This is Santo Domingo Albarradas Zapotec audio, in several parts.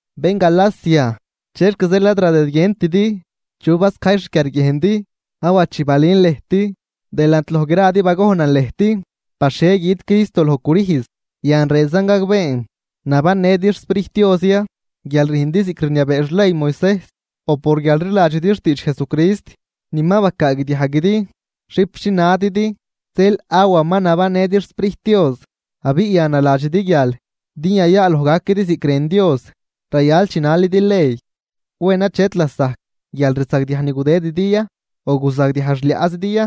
¡Bén Galacia, chexc zeel ad radëdguientidi! ¿Chu bascajy xquiarguiejndi? Awa chi balün lëjt, delant loj gradi bagojnan lëjt par xhie güjt Cristo loj crüjz. Yan rënzan gagbeen: ¿Nabannëdi xSprijt Dios ya guial rüjndi ziꞌc rniabee xley Moisejs o por guial rliladxidi xtiidx Jesucrist ni ma bacaagdiajguidi? Xipxi nadidi zeel awa ma nabannëdi xSprijt Dios abiꞌ yan naladxidi guial din yayaaloj gaquidi ziꞌc rën Dios rayal chinalidi ley. ¿Wen achet lasajc guialrzagdiaj ni gudëdidi ya, o guzagdiaj xliaꞌzidi ya?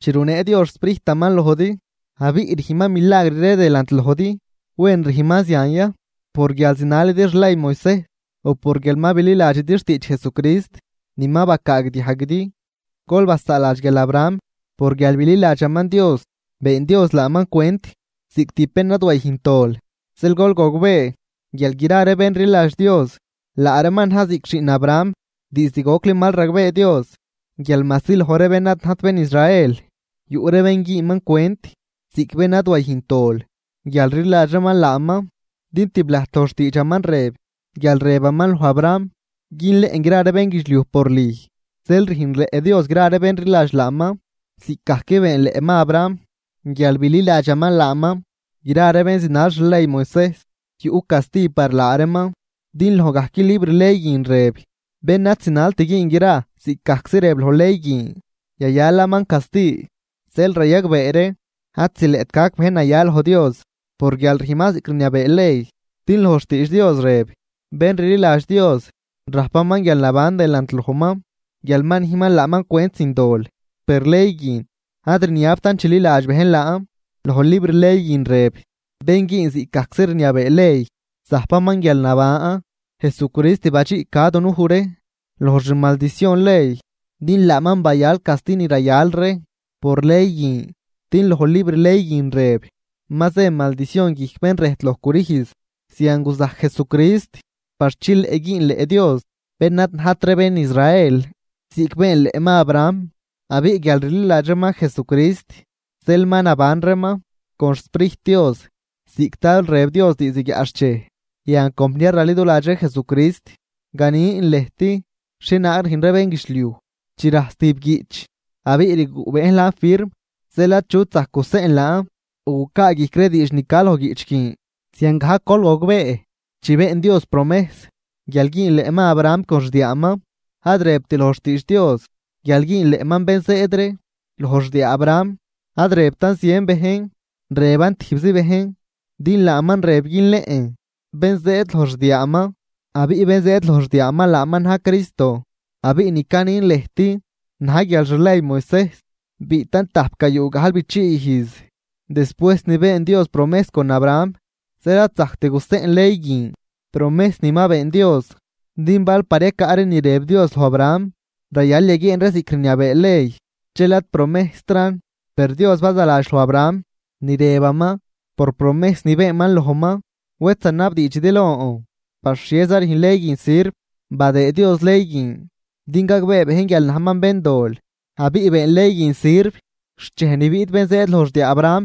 Chi runee Dios xSprijtaman lojdi abiꞌ rüjnman milagr ree delant lojdi, ¿wen rüjnman zian ya por guial zinalidi xley Moisejs o por guial ma bililadxidi xtiidx Jesucrist ni ma bacaagdiajguidi? Gol basaaladx guial Abraham por guial bililadxaman Dios, been Dios laaman cwent ziꞌc tijb bén ad wayüjnt dol. Zeel gol gogbee guial gra ree bén rliladx Dios, laa reeman na̱j ziꞌc xiꞌn Abraham. Diizd gocli mal ragbee Dios guial majsi loj ree bén ad najt bén Israel yuꞌ ree bén güünman cwent ziꞌc bén ad wayüjnt dol guial rliladx reeman laaman. Din tiblajt loj xtiidxaman rëb guial rëbaman loj Abraham: “Günleꞌn gra ree bénguidxliuj por lüj.” Zeel rüjnleꞌ Dios gra ree bén rliladx laaman ziꞌcgajc beenleꞌman Abraham guial bililadxaman laaman. Gra ree bén zinal xley Moisejs yuꞌ casti par laa reeman din loj gajc libr ley guin rëb: “Bén ad zinalt güün gra ziꞌcgajczi rëb loj ley guin, yayalaman casti.” Zeel rayagbee ree ad zileꞌt gac bejn naya loj Dios por guial rüjnman ziꞌc rniabee ley. Din loj xtiidx Dios rëb: “Bén rliladx Dios rajpaman guialnaban delant lojman guial ma nüjnman laaman cwent sin dol.” Per ley guin ad rniabtan chililadx bejn laan, loj libr ley guin rëb: “Bén güün ziꞌc gajczi rniabee ley, zajpaman guialnaban.” Jesucrist badxiꞌca dunuj ree loj xmaldicion ley din laaman bayal casti ni rayal ree por ley guin, din loj libr ley guin rëb: “Ma zë maldicion guijc bén rëjt loj crüjz.” Zian guzajc Jesucrist par chileꞌ güünleꞌ Dios bén ad najt ree bén Israel, ziꞌc beenleꞌman Abraham. Abiꞌ guial rliladx reeman Jesucrist zeel ma naban reeman con xSprijt Dios ziꞌc tal rëb Dios diizd guiaꞌxchej. Yan compniar raliduladx ree Jesucrist ganin lëjt xhienaag rüjn ree bénguidxliuj: Chi rajs tijb guiꞌch abiꞌ rguꞌ bejn laan firm, dxel achut zajc guseꞌn laan o gucaa guijc ree diidx ni ca loj guiꞌch guin. Ziangajc gol gogbee, chi been Dios promejs guial güünleꞌman Abraham con xdiaaman, ad rëbt loj xtiidx Dios guial güünleꞌman “bén zëëd ree” loj xdiaa Abraham. Ad rëbtan zien bejn, rëban tijbzi bejn, din laaman rëb günleꞌn “Bén zëëd” loj xdiaaman. Abiꞌ bén zëëd loj xdiaaman laaman na̱j Cristo. Abiꞌ ni canin lëjt na̱j guial xley Moisejs biꞌtan tajpgayuu gajlbichii ijz despuejs ni been Dios promejs con Abraham, zeel ad zajct guseꞌn ley guin promejs ni ma been Dios. Din bal par yacaꞌ ree ni rëb Dios loj Abraham rayal yaguieen ree ziꞌc rniabee ley, dxel ad promejstran. Per Dios bazaladx loj Abraham ni rëbaman por promejs ni beenman lojman. Wed zanabdiidxidi lon, ¿par xhieza rüjn ley guin sirv? Badëë Dios ley guin din gagbee bejn guial najman béndol, abiꞌ been ley guin sirv xt dxej ni biꞌt bén zëëd loj xdiaa Abraham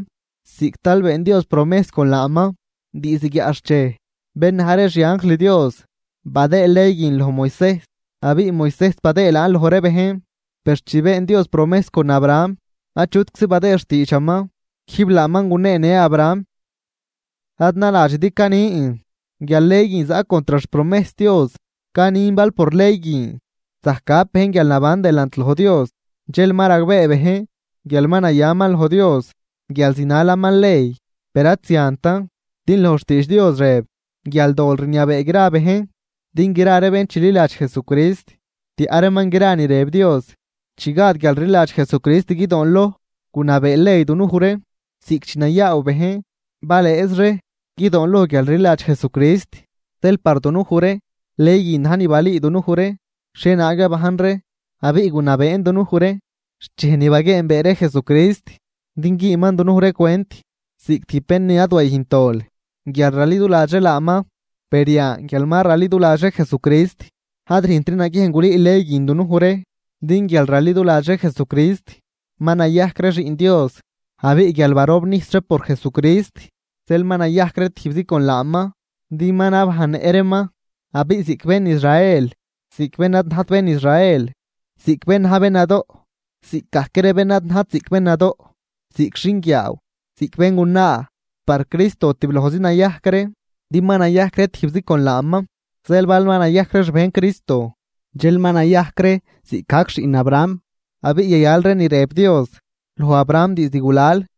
ziꞌc tal been Dios promejs con laaman diizd guiaꞌxchej. Bén na̱j ree xianjl Dios badëë ley guin loj Moisejs, abiꞌ Moisejs badëëd laan loj ree bejn. Per chi been Dios promejs con Abraham achutczi badëëd xtiidxaman, quijb laaman guneenë Abraham. Ad naladxidi canin guial ley guin zaꞌ contr xpromejs Dios. Canin bal por ley guin zajc gap bejn guialnaban delant loj Dios, dxel ma ragbee bejn guial ma nayaman loj Dios guial zinalaman ley. Per ad ziantan din loj xtiidx Dios rëb guial dol rniabee gra bejn din gra ree bén chililadx Jesucrist tiaꞌ reeman gra ni rëb Dios. Chi gad guialrliladx Jesucrist guidoonloj, gunabee ley dunuj ree, ziꞌc chi nayaaw bejn balëëz ree guidoonloj guialrliladx Jesucrist. Zeel par dunuj ree ley guin na̱j ni balüü dunuj ree xhienaag yabajn ree abiꞌ gunabeen dunuj ree xt dxej ni baguieenbee ree Jesucrist din güünman dunuj ree cwent ziꞌc tijb bén ni ad wayüjnt dol guial raliduladx ree laaman. Per yan guial ma raliduladx ree Jesucrist ad rüjntri naguiejn gulüü ley guin dunuj ree. Din guial raliduladx ree Jesucrist ma nayajc ree xiꞌn Dios. Abiꞌ guial barobnijs ree por Jesucrist zeel ma nayajc ree tijbzi con laaman din ma nabajnnëꞌ reeman. Abiꞌ ziꞌc bén Israel ziꞌc bén ad najt bén Israel, ziꞌc bén naj ziꞌc bén nadoꞌ ziꞌc bén ad najt ziꞌc bén nadoꞌ, ziꞌc xinguiaaw ziꞌc béngunaa, par Cristo tiblojzi nayajc ree din ma nayajc ree tijbzi con laaman. Zeel bal ma nayajc ree xbejn Cristo dxel ma nayajc ree ziꞌcgajc xiꞌn Abraham abiꞌ yayal ree ni rëb Dios loj Abraham diizd gulal.